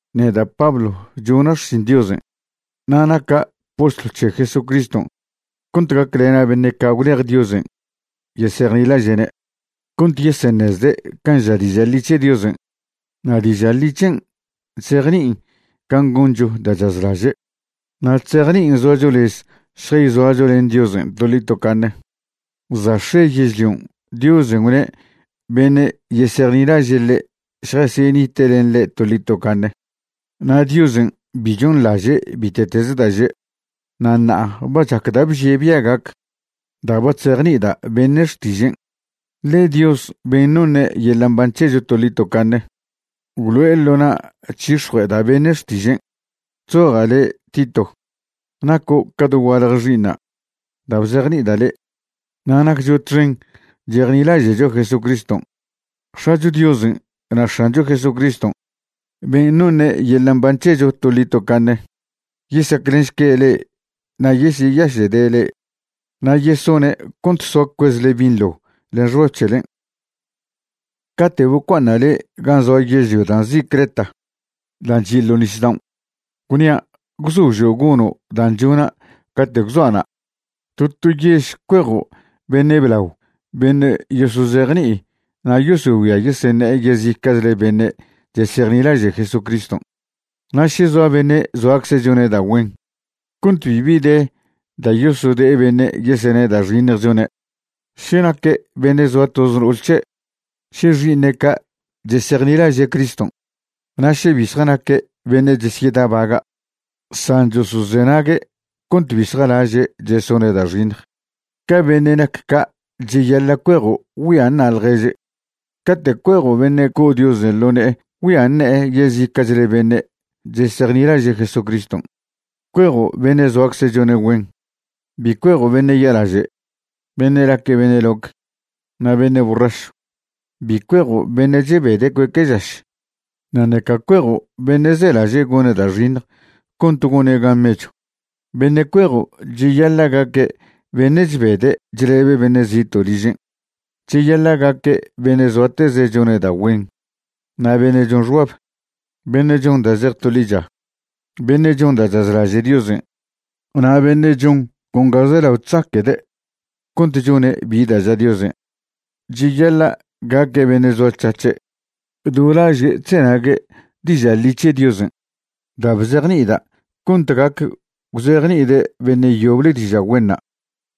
Neda' Pablo chona' xšin Diosen' na' naca' postlw c̱he Jesucriston' cont gaclena' beṉe' ca' gwlej Diosen' yesejnilaže'ne', cont yeseṉezde' can' ža diža' ḻi c̱he Diosen'. Na' diža' ḻi c̱hen' chzejni'in can' goncho da' chazlaže', na' chzejni'in zoacho lez šjayzoacho len Diosen' toḻi tocaṉe. Za' x̱e yežlion' Diosen' gwne' beṉe' yesejnilaže' ḻe' šjasyenite' len ḻe' toḻi tocaṉe, na' Diosen' bi chonḻaže' bite'teze da' že'. Na' ṉa'a ba chac da' bžie' bia' gac da' ba chzejni'ida' beṉe' xtižen', ḻe Dios ben' noṉe' yeḻa' mban c̱hecho toḻi tocaṉe gwlo'e ḻo na' chyix̱jue'eda' beṉe' xtižen'. Chzoja' le' Tito, naco' ca dogualje xi'iṉa' da' bzejni'ida' le', na' naccho txen chejnilaže'cho Jesucriston'. X̱acho Diosen' na' X̱ancho Jesucriston' ben' noṉe' yeḻa' mban c̱hecho toḻi tocaṉe yesaclenšque' le'e na' yesyeyaše'de' le'e na' yesone' cont soa cuezle binḻo len xbab c̱helen'. Cate' bocua'aṉa' le' gan' zoa yežlio da' nzi' Creta dan' chi' ḻo nisdaon', gwnia' gwzožo' gono' dan' chona' cate' gwzoa' na', to to yež cuejo' beṉe' blao beṉe' yosozejni'i na' yosogüia yeseṉe'e yezica'chle beṉe' chesejnilaže' Jesucriston'. Na' še zoa beṉe' zoacze' chone' da' güen cont bibi de da' yosode'e beṉe' yesene' da' xiṉjen' chone', še naque' beṉe' zoa toz no'ol c̱he', še xi'iṉe' ca' chesejnilaže' Criston', na' še bi zjanaque' beṉe' chesyedabaga', san chosozenague' cont bi zjalaže' chesone' da' xiṉj, ca beṉe' nac ca' cheyaḻa' cuejo' güia ṉa' ḻježe'. Cate' cuejo' beṉe' co' Diosen' ḻo ne'e güia ṉe'e yezica'chle beṉe' chesejnilaže' Jesucriston', cuejo' beṉe' zoacze' chone' güen. Bi cuejo' beṉe' ya'laže', beṉe' naque' beṉe' loc, na' beṉe' borrašw. Bi cuejo' beṉe' chebede' cueque' žaš, na' ṉeca cuejo' beṉe' zelaže' gone' da' xiṉj cont gone' gan mechw. Beṉe' cuejo' cheyaḻa' gaque' beṉe' chbede' chlebe' beṉe' zito' ližen'. Cheyaḻa' gaque' beṉe' zoateze' chone' da' güen na' beṉe' chon xbab, beṉe' chon da' zej to ḻicha, beṉe' chon da' chazlaže' Diosen' na' beṉe' chon con ga zelao chzaque'de' cont chone' bi da' ža Diosen'. Cheyaḻa' gaque' beṉe' zoac̱hac̱he' do laže' chzenague' diža' ḻi c̱he Diosen' da' bzejni'ida' cont gac gwzejni'ide' beṉe' yoble diža' güenṉa',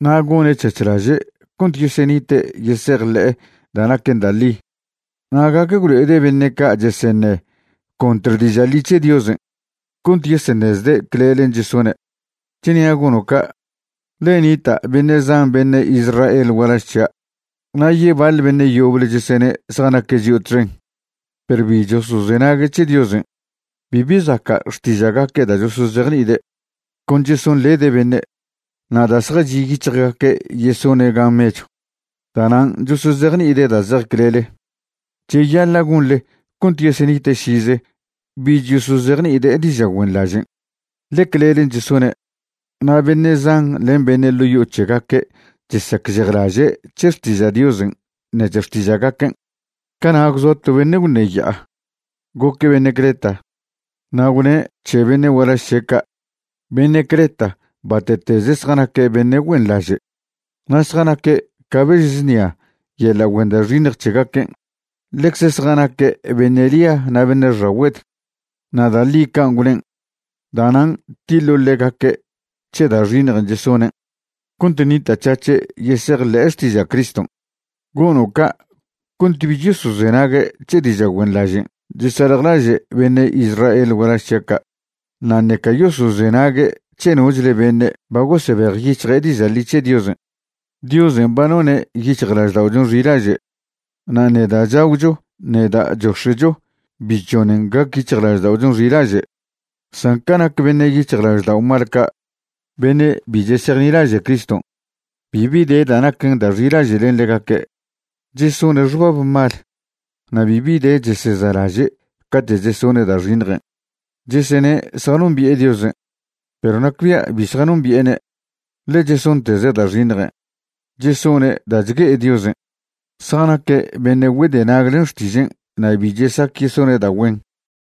na' gone' c̱hac̱hlaže' cont yesenite' yesejḻe'e da' naquen da' ḻi, na' gac gwlo'ede' beṉe' ca' cheseṉe' contr diža' ḻi c̱he Diosen' cont yeseṉezde' clelen' chesone'. Chnia' gono' ca', ḻe nita' beṉe' zan beṉe' Israel gualaž c̱hia' na' yebaḻ beṉe' yoble chesene' zjanaque' chio' txen, perw bi chosozenague' c̱he Diosen'. Bibi zaca' xtiža'gaque' da' chosozejni'ide', con chesonḻede' beṉe'. Na' da' zjachi' yic̱hjgaque' yesone' gan mechw, da'nan' chosozejni'ide' da' zej clele. Cheyaḻa' gonḻe cont yesenite' šize bich yosozejni'ide' diža' güenḻažen', ḻe clelen' chesone'. Na' beṉe' zan len beṉe' ḻo' yo'o c̱hegaque' chesacžejlaže' c̱he xtiža' Diosen' ṉec̱he xtiža'gaquen'. Cana' gwzoa to beṉe' gwṉeya'a, goque' beṉe' Creta, na' gwne' c̱he beṉe' gualaž c̱he' ca': “Beṉe' Creta bate'teze zjanaque' beṉe' güenḻaže' na' zjanaque' ca bež znia' yeḻa' güen da' xiṉj c̱hegaquen'. Ḻecze zjanaque' beṉe' lia na' beṉe' xagüed.” Na' da' ḻi can' gwnen'. Da'nan' tiḻo' ḻegaque' c̱he da' xiṉjen' chesonen' cont ṉita'c̱hac̱he' yesejḻe'e xtiža' Criston'. Gono' ca' cont bich yosozenague' c̱he diža' güenḻažen' chesaljlaže' beṉe' Israel gualaž c̱hia' ca', na' ṉeca yosozenague' c̱he nochle beṉe' ba gosebejyic̱hje' diža' ḻi c̱he Diosen'. Diosen' ba none' yic̱hjlažda'ochon' xilaže', na' ṉe da' chagwcho ṉe da' chox̱e'cho bi chžonen gac yic̱hjlažda'ochon' xilaže'. San ca nac beṉe' yic̱hjlaždao' mal ca', beṉe' bi chesejnilaže' Criston', bibi de da' naquen da' xilaže' len ḻegaque'. Chesone' xbab mal, na' bibi de cheseza'laže' cate' chesone' da' xiṉjen'. Chesene' zjanombi'e Diosen', perw nacbia' bi zjanombi'ene', ḻe chesonteze' da' xiṉjen'. Chesone' da' chgue'e Diosen'; zjanaque' beṉe' güedenag len xtižen' na' bi chesac yesone' da' güen.